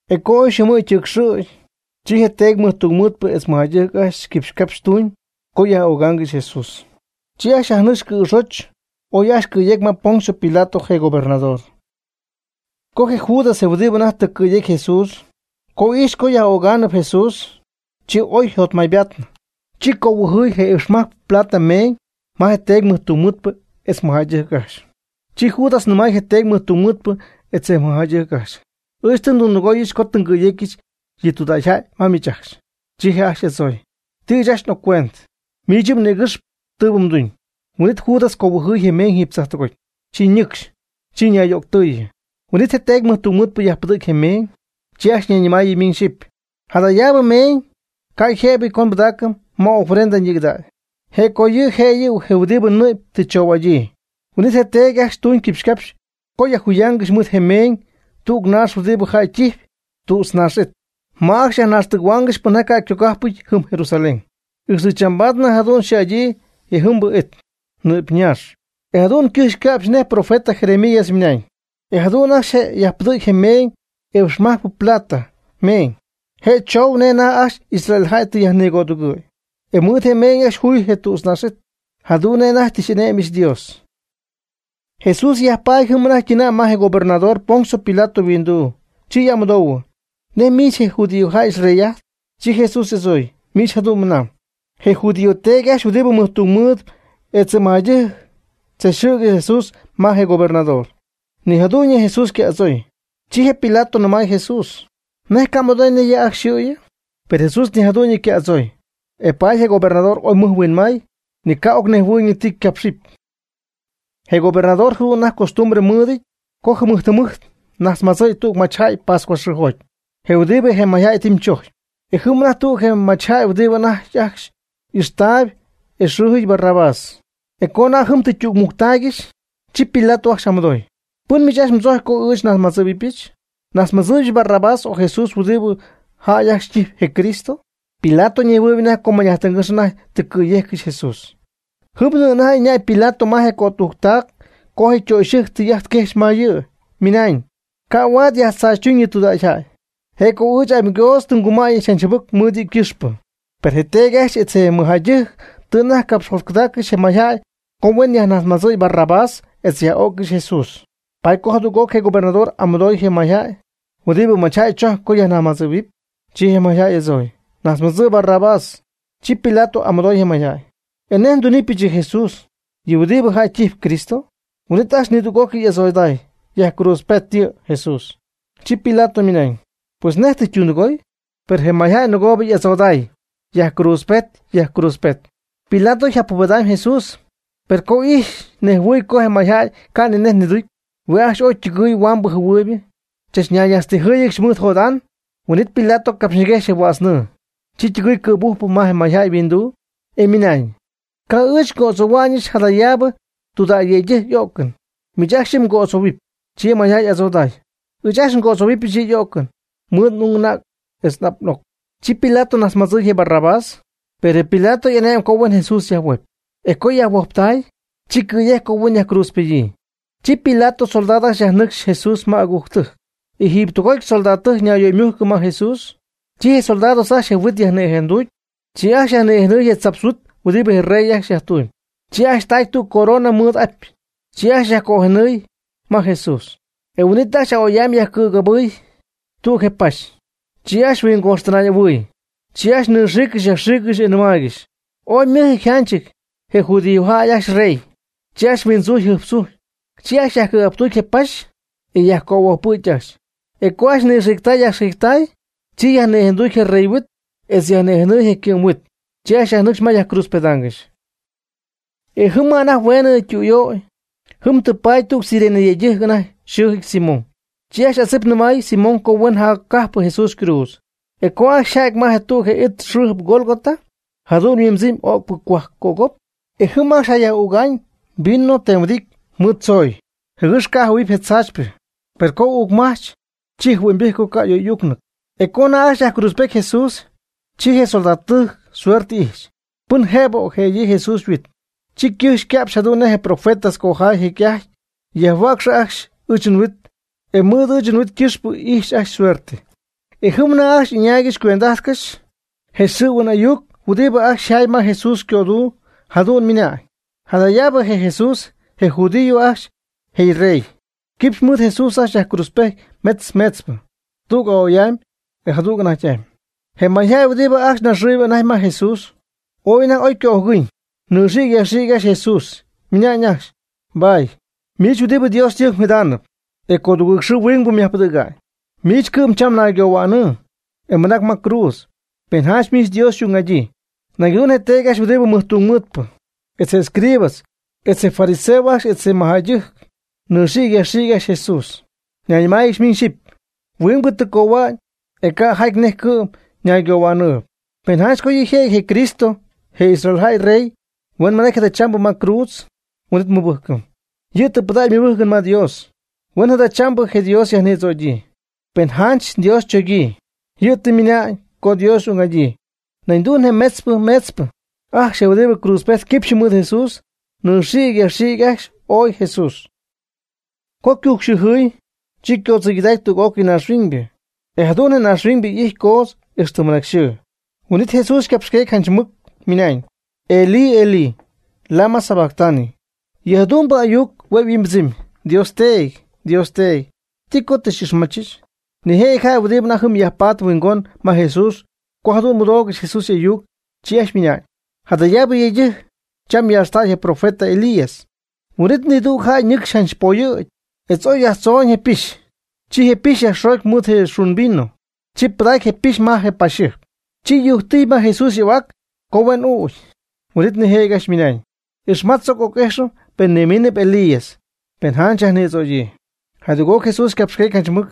E co oy yxɨɨmɨ̈y ytɨcxɨ̈y, chi je teedy mɨjtungmɨɨdpɨ etz je mɨjjäydɨjc ajcxy quipxycapxy co yaj'ögaangɨxy Jesús. Chi ajcxy yajnɨcxy cɨ̈xoch oy ajcxy cɨ̈yecy ma Poncio Pilato je gobernador. Co je Judas je huɨdibɨ anajty tɨ cɨ̈yecy Jesús, co ijxy co yaj'ögaanɨp Jesús, chi oy yjotmaybaatnɨ. Chi conhuimbijty je iipxmajcpɨ plata meeñ ma je teedy mɨjtungmɨɨdpɨ etz mɨjjäydɨjc ajcxy. Chi Judas nɨmay je teedy mɨjtungmɨɨdpɨ etz je mɨjjäydɨjc ajcxy: ―Ɨɨch tɨ ndundɨgooyɨch co tɨ ngɨ̈yecyɨch yɨ tudägyjäy ma miich ajcxy. Chi je' ajcxy y'adzooy: ―Ti ɨɨch ajcxy n'occuent. Miich yɨ' mnïgɨxp tɨɨbɨ mduñ. Huin'it Judas cohuɨjɨy je meeñ jiiby tzajtɨgoty. Chi ñɨcxy. Chi ñayyöctɨɨyɨ. Huin'it je teedy mɨjtungmɨɨdpɨ yajpɨdɨ̈gy je meeñ. Chi ajcxy ñayñɨmaayɨ miñ xyɨpy: ―Jadayaabɨ meeñ ca' yjëbɨty co nbɨdaacɨm ma ofrenda ñigɨdägy. Je' co yɨ' yjëjɨty je huɨdi nɨ'py tɨ tzoo'adyii. Huin'it je teedy ajcxy tuñ je quipxycapxy co juyaangɨxy mɨɨd je meeñ tüg naax huɨdibɨ jäy ytijp, tütznaax it, ma ajcxy yajnaxtɨgɨ̈huɨpy pɨnjaty ca' ycogajpɨty jɨm Jerusalén. Ixtɨ chambaad jadu'n xɨɨ'adyii jejɨmbɨ it: Nɨ'py naax. E jadu'n ycɨjx yca'px nej je profeta Jeremías ymɨnañ: “E jadu'n ajcxy je' yajpɨdɨ̈gy meeñ iipx majcpɨ plata meeñ (je' choou nej anajty ajcxy Israeljäy tɨ yajnigödugɨ̈y), e mɨɨd je meeñ ajcxy juy je tütznaax it, jadu'n nej anajty tɨ xy'ane'myɨch Dios.” Jesús yajpaady jɨm anajty ytɨnäy ma je gobernador Poncio Pilato yhuinduu, chi y'amɨdoohuɨ: ―¿Nej miich je' judíos jäy xyrey'ajtp? Chi Jesús y'adzooy: ―Miich jadu'n mɨnamb. Je judío teedy ajcxy huɨdibɨ mɨjtungmɨɨdpɨ etz je mɨjjäydɨjc tzachxɨ̈gɨxy Jesús ma je gobernador. Ni jadu'ñyɨ Jesús ca' y'adzooy. Chi je Pilato ñɨmay Jesús: ―¿Nej ca' mmɨdooy nej yɨ' ajcxy yxɨ̈yɨ? Per Jesús ni jadu'ñyɨ ca' y'adzooy. E paady je gobernador oy mɨj huinmay, ni ca' ocnejhuɨɨyñɨ ti ycapxɨpy. Je gobernador jadu'n anajty ycostumbre mɨɨdɨty co jɨmɨjt jɨmɨjt najtzmadzɨ̈y tüg machyjäy pascua xɨɨjoty, je huɨdibɨ je mayjäy tɨ ytɨmychojcpy. E jɨm anajty tüg je machjäy huɨdibɨ anajty ajcxy ixy'ajttaayb, e yxɨɨjɨty Barrabás. E co anajty jɨm tɨ ytügmujctaaygɨxy, chi Pilato ajcxy y'amɨdooy: ―¿Pɨn miich ajcxy mdzojcpy co ɨɨch nnajtzmadzɨ̈huɨbɨchɨ? ¿Najtzmadzɨ̈yɨch Barrabás o Jesús huɨdibɨ jäy ajcxy ytijpy je Cristo? Pilato ñejhuɨɨyb anajty co mañ'ájtɨngɨ́x anajty tɨ cɨ̈yejccɨxy Jesús. Jɨmnɨ anajty ɨñäy Pilato me je ycötujctac co je ytöxyɨjc tɨy'ajt quejxy ma yɨ', ymɨnañ: “Ca' huaad myajtzaachytuñ yɨ tudägyjäy. Je' co ɨɨch amygoodz tɨ ngumäyɨch janch jɨbɨc mɨɨd yɨ' ycɨxpɨ.” Per je teedy ajcxy etz je mɨjjäydɨjc tɨ anajty capxyjotcɨdaaccɨxy je mayjäy co huen yajnajtzmadzɨɨy Barrabás etz huen yaj'öccɨxy Jesús. Paady co jadüg'oc je gobernador y'amɨdooy je mayjäy: ―¿Huɨdibɨ machyjäy mdzojcpy co nnajtzmadzɨ̈huɨbɨch? Chi je mayjäy y'adzooy: ―Najtzmadzɨ' Barrabás. Chi Pilato y'amɨdooy je mayjäy: ―¿E nej ndunɨpyɨch yɨ Jesús, huɨdibɨ jäy ytijpy Cristo? Huin'it ajcxy nidüg'ócɨy y'adzoday: ―¡Yajcruutzpet yɨ Jesús! Chi Pilato ymɨnañ: ―Pues, ¿nej tɨ ytundɨgooy? Per je mayjäy nɨgoob y'adzoday: ―¡Yajcruutzpet! ¡Yajcruutzpet! Pilato yjapubedaan Jesús, per co ijxy nejhuɨɨy co je mayjäy ca' ni nej niducy. Hue' ajcxy oy ytɨgɨɨy huambɨ jɨhuɨɨybɨ, chach ñayñajtztijɨɨygɨxy mɨɨd jot'an. Huin'it Pilato capxyñiguejxy je huädz nɨɨ. Chi ytɨgɨɨy cɨ̈bujp ma je mayjäy yhuinduu, e ymɨnañ: ―Ca' ɨɨch ngo'adzohuɨpyɨch jadayaabɨ tudägyyëydɨjc y'o'cɨn. Miich ajcxy yɨ' mgo'adzoohuɨpy. Chi je mayjäy y'adzoday: ―Ɨɨch ajcxy ngo'adzohuɨpyɨch yɨ' y'o'cɨn mɨɨd n'ung anäg etz n'ap n'oc. Chi Pilato najtzmadzɨy je Barrabás. Per Pilato ane'my co huen Jesús yajhuojp. E co yajhuojptay, chi cɨ̈yejcy, co huen yajcruutzpedyii. Chi Pilato ysoldados ajcxy yajnɨcxy Jesús ma agujctɨjc. E jiiby tüg'ócɨy soldadtɨjc ñayyöymujcɨ ma Jesús. Chi je soldado ajcxy je' yhuit yajnïjenducy. Chi ajcxy yajnïjenɨy je tzapx huit huɨdibɨ je rey ajcxy yajtuumyb. Chi ajcxy tacy tüg corona mɨɨd apy. Chi ajcxy yajcöjenɨy ma Jesús. E huin'it ajcxy a'oy'amy yajcɨ̈gabɨɨy tüg je paxy. Chi ajcxy huingojxtɨnay'ahuɨɨy. Chi ajcxy nɨxiicy yajxiicy, e ymɨnaangɨxy: ―¡Ooy ymɨjɨty yjanchɨty, je judíos ajcxy yrey! Chi ajcxy huindzujy jɨjptzujy. Chi ajcxy yajcɨ̈gajptucy je paxy, e yajcöhuojpɨ̈gy ajcxy. E co ajcxy nɨxiictay yajxiictay, chi yajnïjenducy je rey yhuit etz yajnïjenɨy je ycɨ'm huit. Chi ajcxy yajnɨcxy ma yajcruutzpedaangɨxy. E jɨm ma anajty hueenɨ tɨ ytüyöy, jɨm tɨ paty tüg Cirene yëydɨjc anajty yxɨɨjɨty Simón. Chi ajcxy adzɨp nɨmay Simón co huen jaccapɨ Jesús ycruudz. E co ajcxy yja'ty ma tüg je it yxɨɨjɨp Gólgota, jadu'n yhuimbɨdzɨm Öcpɨ Cohuajc Cögop. E jɨm ajcxy Jesús jayaj'üga'ñ vino temhuɨdity mɨɨd tzooy, jɨgɨx ca' jɨhuɨ̈huɨp je tzaachypɨ. Per co uucmajch, chi jɨhuɨ'ñybɨjc co ca' y'oy'uucnɨty. E co anajty ajcxy yajcruutzpety Jesús, chi je soldadtɨjc suerte ijxy, pɨn jëbɨ ocjë'adyii Jesús yhuit, chi ycɨjxy yca'pxy jadu'n nej je profeta cojaay jecy'ajty: “Yajhuäcxɨpy ajcxy ɨɨch nhuit e mɨɨd ɨɨch nhuit ycɨxpɨ ixɨpy ajcxy suerte.” E jɨm anajty ajcxy ɨñaaygɨxy cuend'ajtcɨxy. Je xɨ̈huɨn ayuc huɨdibɨ ajcxy yjaay ma Jesús ycöduu jadu'n ymɨnañ: “Jadayaabɨ je' Jesús, je judíos ajcxy je yrey.” Quipxy mɨɨd Jesús ajcxy yajcruutzpejty metz meetzpɨ. Tüg a'oy'amy, e jadüg anajty'amy. Je mayjäy huɨdibɨ ajcxy naxɨɨyb anajty ma Jesús, ooy anajty oy ycöjɨgɨñ, nɨxïgy yajxïgy ajcxy Jesús, ymɨna'ñ ajcxy: ―Bah, miich huɨdibɨ Dios ytɨjc jidaanɨp, e codugɨɨg xɨɨ huingbɨ myajpɨdɨ̈ga'ñ. Miich cɨ'm cham naygohuänɨɨ, e mɨnac cruudzcɨ́xy, pen janch miich Dios xy'ung'adyii. Nañ jadu'n je teedy ajcxy huɨdibɨ mɨjtungmɨɨdpɨ, etz je escribas, etz je fariseos ajcxy etz je mɨjjäydɨjc nɨxiicy yajxiicy ajcxy Jesús, ñayñɨmáayɨgɨxy miñ xyɨpy: ―Huingbɨ tɨ cohua'ñ, e ca' jaty nej cɨ'm ñaygohua'nɨɨyb. Pen janch co yɨ' jëjɨty je Cristo je Israel jäy rey, huen mɨnacy jadachambɨ ma cruudz, huin'it nmɨbɨjcɨm. Yɨ' tɨ pɨdägy ymɨbɨjcɨn ma Dios; huen jadachambɨ je Dios yajnïdzögyii, pen janch Dios chogyii; yɨ' tɨ ymɨna'ñ co Dios y'ung'adyii. Nañ jadu'n je metzpɨ meetzpɨ ajcxy huɨdibɨ cruudzpejt quipxy mɨɨd Jesús nɨxiicy yajxiicy ajcxy ooy Jesús. Co ycujcxɨɨjɨɨy, chi ycoodzɨyday tüg'ócɨy naaxhuiñybɨ. E jadu'n je naaxhuiñybɨ y'ijty coodz, ixtɨ mɨnacy yxɨɨ. Huin'ítɨy Jesús ycapxyqueecy janch mɨc ymɨnañ: ―Elí, Elí, ¿lama sabactani? ―yɨ jadu'mbɨ ayuc hue' yhuimbɨdzɨmy: Dios Teedy, Dios Teedy, ¿ti co tɨ xy'ixmachɨch? Nijëjɨty jäy huɨdibɨ anajty jɨm yajpatp huingon ma Jesús co jadu'n mɨdoogɨxy Jesús y'ayuc, chi ajcxy ymɨnañ: ―Jadayaabɨ yëydɨjc cham yaaxtaayb je profeta Elías. Huin'it nidüg jäy ñɨcxy janch poyɨ̈gy etz oy yajtzooñ je pixy. Chi je pixy yajxoogy mɨɨd je xun vino. Chi pɨdacy je pixy ma je paxyjɨjp. Chi yujctijy ma Jesús y'ahuac co huen ügy. Huin'it nijëjɨty ajcxy ymɨnañ: ―Ixmatz, tzoc ajt oc'ijxɨm, pen nimiinɨp Elías, pen janch yajnïdzögyii. Jadüg'oc Jesús yaaxqueegy janch mɨc.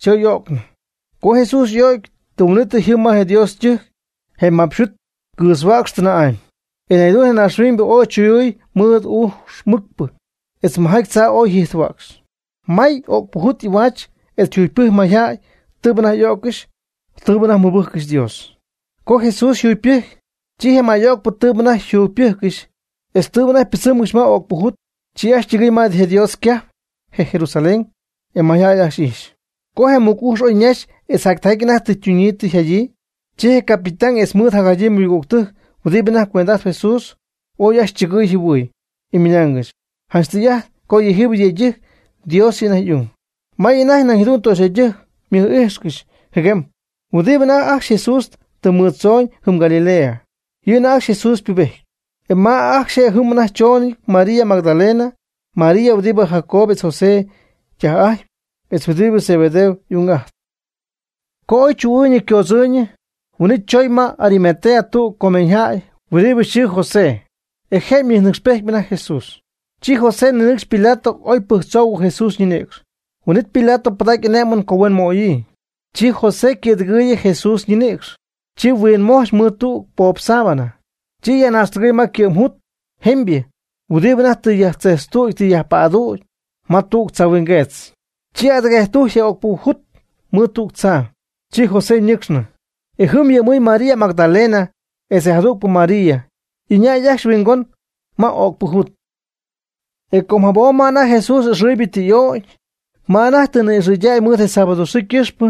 Chi oy y'o'cnɨ. Co Jesús y'o'cy, tɨm huin'ítɨy jɨm ma Dios ytɨjc je mapxy yhuit ycɨɨtzhua'cxy tɨnä'amy. E nañ jadu'n je naaxhuiñybɨ ooy chuyuy mɨɨd ujx mɨcpɨ etz je mɨjjatychaa oy jiitzhua'cxy. May öcpɨ jut y'ahuach etz yjugypɨjcy mayjäy tɨɨbɨ anajty y'o'ccɨxy tɨɨbɨ anajty mɨbɨjccɨxy Dios. Co Jesús yjugypɨjcy, chi je may'öcpɨ tɨɨbɨ anajty jugypɨjccɨxy etz tɨɨbɨ anajty pɨdzɨmgɨxy ma öcpɨ jut, chi ajcxy ytɨgɨɨy ma je Dios ycajp, je Jerusalén. E mayjäy ajcxy ijxy. Co je mɨc ujx oy ñaxy etz jac tijaty anajty tɨ ytuñyii tɨ yjadyii, chi je capitán etz mɨɨd jadyii ymɨgügtɨjc huɨdibɨ anajty cuend'ajtp Jesús ooy ajcxy chɨgɨy yjɨhuɨy, e mɨnaangɨxy: ―Janch tɨy'ajt co yɨjiibɨ yëydɨjc Dios yɨ' anajty y'ung. May anajty nañ jadu'n töxyjäydɨjc ymɨj'ijxcɨxy jɨguem huɨdibɨ anajty ajcxy Jesús tɨ mɨɨddzoon jɨm Galilea. Yɨ' anajty ajcxy Jesús ypubejtp. E ma je' ajcxy jɨm anajty chooñɨty, María Magdalena, María huɨdibɨ Jacobo etz José ytaj'ajtpy, etz je huɨdibɨ Zebedeo y'ung ytaj'ajtpy. Co oy chuu'ɨɨyñɨ ycoodzɨɨyñɨ, huin'it chooñ ma Arimatea tüg comeeñyjäy huɨdibɨ yxɨɨ José. E je' ymɨjnɨcxpejty anajty Jesús. Chi José ninɨcxy Pilato oy pɨjctzou Jesús ñinïcx. Huin'it Pilato pɨdacy y'ane'mɨn co huen möyii. Chi José ycɨ̈dɨgɨɨyɨ Jesús ñinïcx. Chi huinmojch mɨɨd tüg poob sábana. Chi yajnaaxtɨgɨy ma je ycɨ'm jut jemybɨ huɨdibɨ anajty tɨ yajtzejtztüty tɨ yajpädüty ma tüg tzahuingueetz. Chi adɨguejctujcy je öcpɨ jut mɨɨd tüg tzaa. Chi José ñɨcxnɨ. E jɨm yhuɨ'my María Magdalena etz je jadügpɨ María, y'ɨñäy ajcxy ymɨhuingon öcpɨ jut. E com jabom ma anajty Jesús ɨxɨɨybɨ tɨ y'ögy, ma anajty tɨ ni'ixɨydäy mɨɨd je sábado xɨɨ ycɨxpɨ,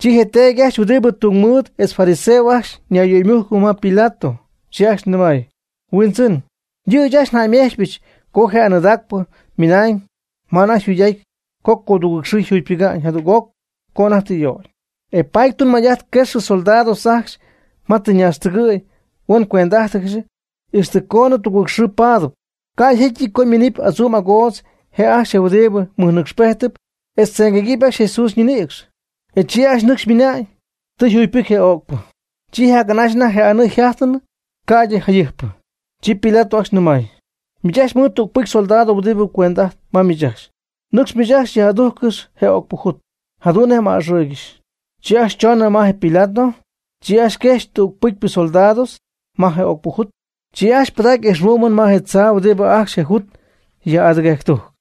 chi je teedy ajcxy huɨdibɨ tungmɨɨd etz je fariseos ajcxy ñayyöymujcɨ ma je Pilato. Chi ajcxy ymɨnañ: ―Huindzɨn, yɨ' ɨɨch ajcxy njäymejchpyɨch co je anɨɨdacpɨ ymɨnañ ma anajty yjuugyɨty co codugɨɨg xɨɨ jugypɨga'ñ jadüg'oc co anajty tɨ y'ögy. E paady tunmay'ajt quexɨpy soldados ajcxy ma Jesús tɨ ñaaxtɨgɨ̈y huen cuend'ajtcɨxy ixtɨ coonɨ tugɨɨg xɨɨbɨ paadɨpy. Ca' yjecyɨty co ñiminɨɨb adzuum agoodz je' ajcxy huɨdibɨ mɨjnɨcxpejtɨp etz tzɨmguëgɨpy ajcxy Jesús ñinïcx. E chi nɨcxy jäy ymɨna'ñ: “Tɨ yjugypɨcy je öcpɨ.” Chi anajty jac'anaxy je anɨɨ tɨ yjajtnɨ ca'ydɨ je jayɨjpɨ. Chi Pilato ajcxy nɨmay: ―Miich ajcxy mɨɨd tüg pɨcy soldados huɨdib cuend'ajtp ma miich ajcxy. Nɨ́cxcɨx miich ajcxy yaj'adujccɨxy je öcpɨ jut, jadu'n nej m'a'ɨxɨɨygɨxy. Chi ajcxy chonɨ ma je Pilato. Chi ajcxy quejxy je tüg pɨcypɨ soldados ma je öcpɨ jut. Chi ajcxy pɨdacy ijxhuɨ'mɨn ma je tzaa huɨdibɨ ajcxy je jut yaj'adɨguejctujcy.